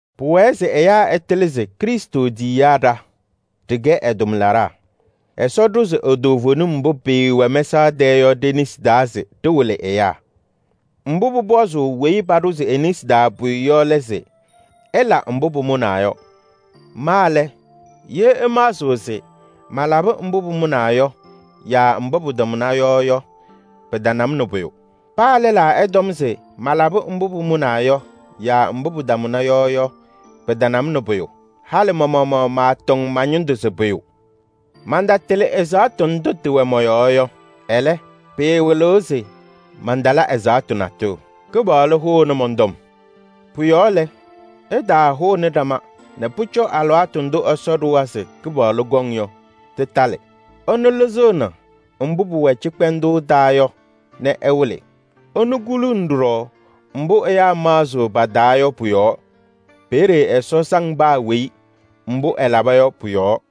Pʋwɛɛ se ɛyaa ɛtɩlɩ se Krɩstʋ tiyiyaa ɖa, ɖɩkɛ ɛ-tʋmlaɖaa. Ɛsɔ ɖʋzɩ e-toovenim mbʋ pɩɩwɛ mɛsaɣ tɛɛ yɔ ɖe-nesi taa se ɖɩwɩlɩ ɛyaa. Mbʋ pʋpɔzʋʋ weyi paɖʋzɩ e-nesi taa pʋyʋ yɔ lɛ se: ɛla mbʋ pʋmʋnaa yɔ. Ma lɛ, ye ɩmaɣzɩɣ se malabɩ mbʋ pʋmʋnaa yɔ yaa mbʋ pɩtamʋna yɔ yɔ, pɩtana-m nɛ pʋyʋ. Paa lɛlaa ɛtɔm se malabɩ mbʋ pʋmʋnaa yɔ yaa mbʋ pɩtamʋna yɔ yɔ, pɩtana-m nɛ pʋyʋ. Halɩ ma-maɣmaɣ maatɔŋ ma-ñɩndʋ se pʋyʋ. Mantatɩlɩ ɛzaɣtʋ ndʋ tɩwɛ mɔ-yɔɔ yɔ. Ɛlɛ, pɩɩwɩlɩɣ se mantala ɛzaɣtʋ natʋyʋ. Kɩpaɣlʋ hʋʋnɩ mɔn-tɔm. Pʋ-yɔɔ lɛ, ɩtaahʋnɩ ɖama nɛ pʋcɔ alɩwaatʋ ndʋ Ɛsɔ ɖʋwa se Kɩpaɣlʋ kɔŋ yɔ, tɩtalɩ. Ɛnʋ lɩzɩɣnɩ mbʋ pʋwɛ cɩkpɛndʋʋ taa yɔ nɛ ɛwɩlɩ. Ɛnʋ kuluuni ɖɔɖɔ mbʋ ɛyaa maɣzɩɣ pa-taa yɔ pʋ-yɔɔ. Peeye Ɛsɔ saŋ paa weyi mbʋ ɛlaba yɔ pʋ-yɔɔ.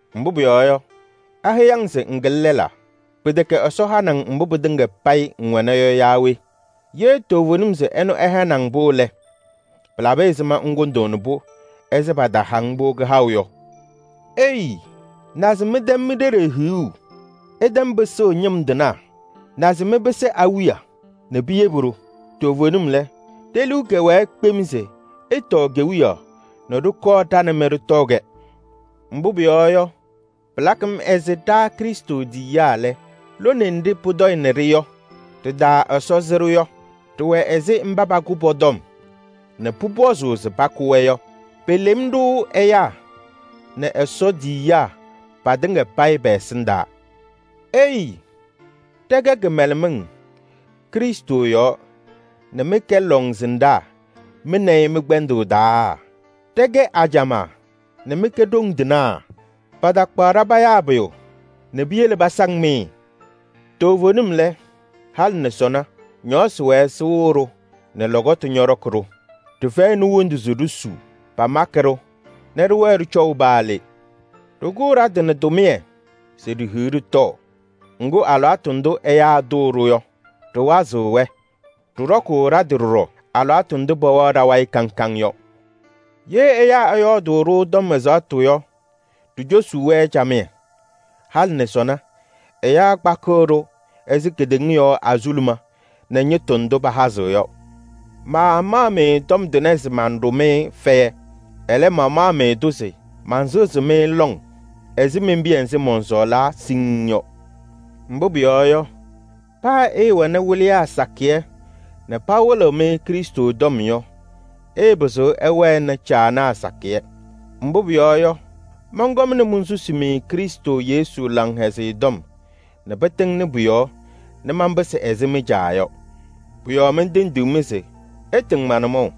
Mbʋ pʋyɔɔ yɔ, aheyi-ŋ se ŋkɩlɩ lɛlaa? Pɩtɛkɛ Ɛsɔ hanɩ-ŋ mbʋ pɩtɩŋa payɩ ŋwɛna yɔ yaa we? Ye toovenim se ɛnʋ ɛhanɩ-ŋ-pʋ lɛ, pɩlabɩ ɛzɩma ŋkʋndʋʋnɩ-pʋ ɛzɩ pataha-ŋ-pʋ kɩhaʋ yɔ? Ei! Naze mɩtɛm mi-ɖeɖe hiɣu! Ɩtɛm pɩsʋʋ ñɩm tɩnaa! Naze mɩpɩsɩ awiya nɛ piyebi-ɖʋ! Toovenim lɛ, ɖe-liu kɛwɛɛ kpem se ɩtɔɔ kewiyaɣ nɛ ɖɩkɔɔ ɖa nɛ mɩ ɖɩtɔɔ-kɛ. Mbʋ pʋyɔɔ yɔ, pɩlakɩ-m ɛzɩ ɖa Krɩstʋ tiyiyaa lɛ, lone nɖɩ pʋtɔyɩnɩ-ɖɩ yɔ, ɖɩ-taa Ɛsɔ sɩ-ɖʋ yɔ. Ɖɩwɛ ɛzɩ mba pakʋ pɔ-tɔm nɛ pʋpɔzʋʋ se pakʋ-wɛ yɔ. Pelem-ɖʋ ɛyaa nɛ Ɛsɔ tiyiyaa patɩŋa payɩ pɛ-ɛsɩndaa. Ei! Ɖɛkɛ kɩmɛlɛmɩŋ Krɩstʋ yɔɔ nɛ mɩ mɩkɛ lɔŋsɩnɖaa mɩ nɛ ɩ mɩ-kpɛndʋʋ taa! Ɖɛkɛ ajamaa nɛ mɩkɛ ɖoŋ tɩnaa! Patakpaɣ-ɖa payaa pʋyʋ nɛ piyele pasaŋ-mɩ! Toovenim lɛ, halɩ nɛ sɔnɔ, ñɔɔsɩ wɛɛ sɩwɩɣ-ɖʋ nɛ lɔkɔtʋ ñɔɖɔkɩ-ɖʋ. Ɖɩfɛyɩnɩ wondu se ɖisuu. Pamakɩ-ɖʋ nɛ ɖɩwɛɛ ɖɩcɔʋ paa le. Ɖɩkʋʋ ɖa-tɩ nɛ tʋmɩyɛ se ɖihiɣ ɖɩtɔɔ. Ŋgʋ, alɩwaatʋ ndʋ ɛyaa tʋʋ-ɖʋ yɔ, ɖɩwazɩɣ pɔ-yɔɔ. Ɖɩɖɔkʋʋ ɖa-tɩ ɖɔɖɔ alɩwaatʋ ndʋ pɛwɛɣ ɖa-wayɩ kaŋ kaŋ yɔ. Ye ɛyaa ɛyɔɔdʋʋ-ɖʋ tɔm ɛzaɣtʋ yɔ, ɖicosuu-wɛ camɩyɛ. Halɩ nɛ sɔnɔ, ɛyaa kpakɩɣ-ɖʋ ɛzɩ kedeŋa yɔɔ azuluma nɛ ñɩtʋ ndʋ pahazɩɣ yɔ. Maamaɣ-mɩ tɔm tʋnɛ se manɖʋ-mɩ fɛyɛ. Ɛlɛ, mamaɣ-mɩ-tʋ se mansɩɣzɩ-mɩ lɔŋ ɛzɩ men-piya nzɩ mɔnsɔɔlaa siŋŋ yɔ. Mbʋ pʋyɔɔ yɔ, paa ɩɩwɛnɩ wɩlɩyaa sakɩyɛ nɛ pawɩlɩɣ-mɩ Krɩstʋ tɔm yɔ, ɩɩpɩzɩɣ ɩwɛnɩ caanaa sakɩyɛ. Mbʋ pʋyɔɔ yɔ, mɔnkɔmnɩ monsusi-mɩ Krɩstʋ Yesu Laŋhɛzɩyɛ Tɔm nɛ pɩtɩŋnɩ pʋ-yɔɔ nɛ manpɩsɩ ɛzɩ mɩ-caa yɔ. Pʋ-yɔɔ mentendiɣ-mɩ se ɩtɩŋ ma-nʋmɔʋ.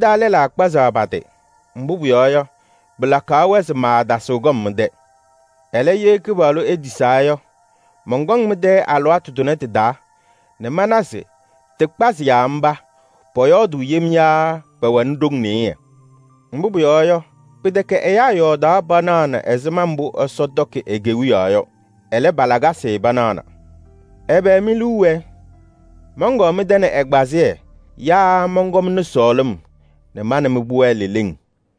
Mɩ-taa lɛlaa kpazaɣ pa-tɩ, mbʋ pʋyɔɔ yɔ, pɩlakaɣ-wɛ se maatasɩɣ kɔm mɩ-tɛ. Ɛlɛ, ye Kɩpaɣlʋ etisaa yɔ, mɔnkɔŋ mɩ-tɛ alɩwaatʋ tʋnɛ tɩ-taa nɛ mana se tɩkpazɩyaa mba pɔyɔɔdʋʋ yem yaa pɛwɛnɩ ɖoŋ nɩɩyɩ. Mbʋ pʋyɔɔ yɔ, pɩtɛkɛ ɛyaa yɔɔdaɣ panaɣnɩ ɛzɩma mbʋ Ɛsɔ tɔkɩ e-Kewiyaɣ yɔ. Ɛlɛ, pa-lakasɩ panaɣna. Ɛbɛ mi-liu wɛɛ: mɔnkɔɔ mɩ-tɛ nɛ ɛgbazɩyɛ yaa mɔnkɔmnɩ sɔɔlɩm nɛ ma nɛ mɩ pʋwɛɛ leleŋ?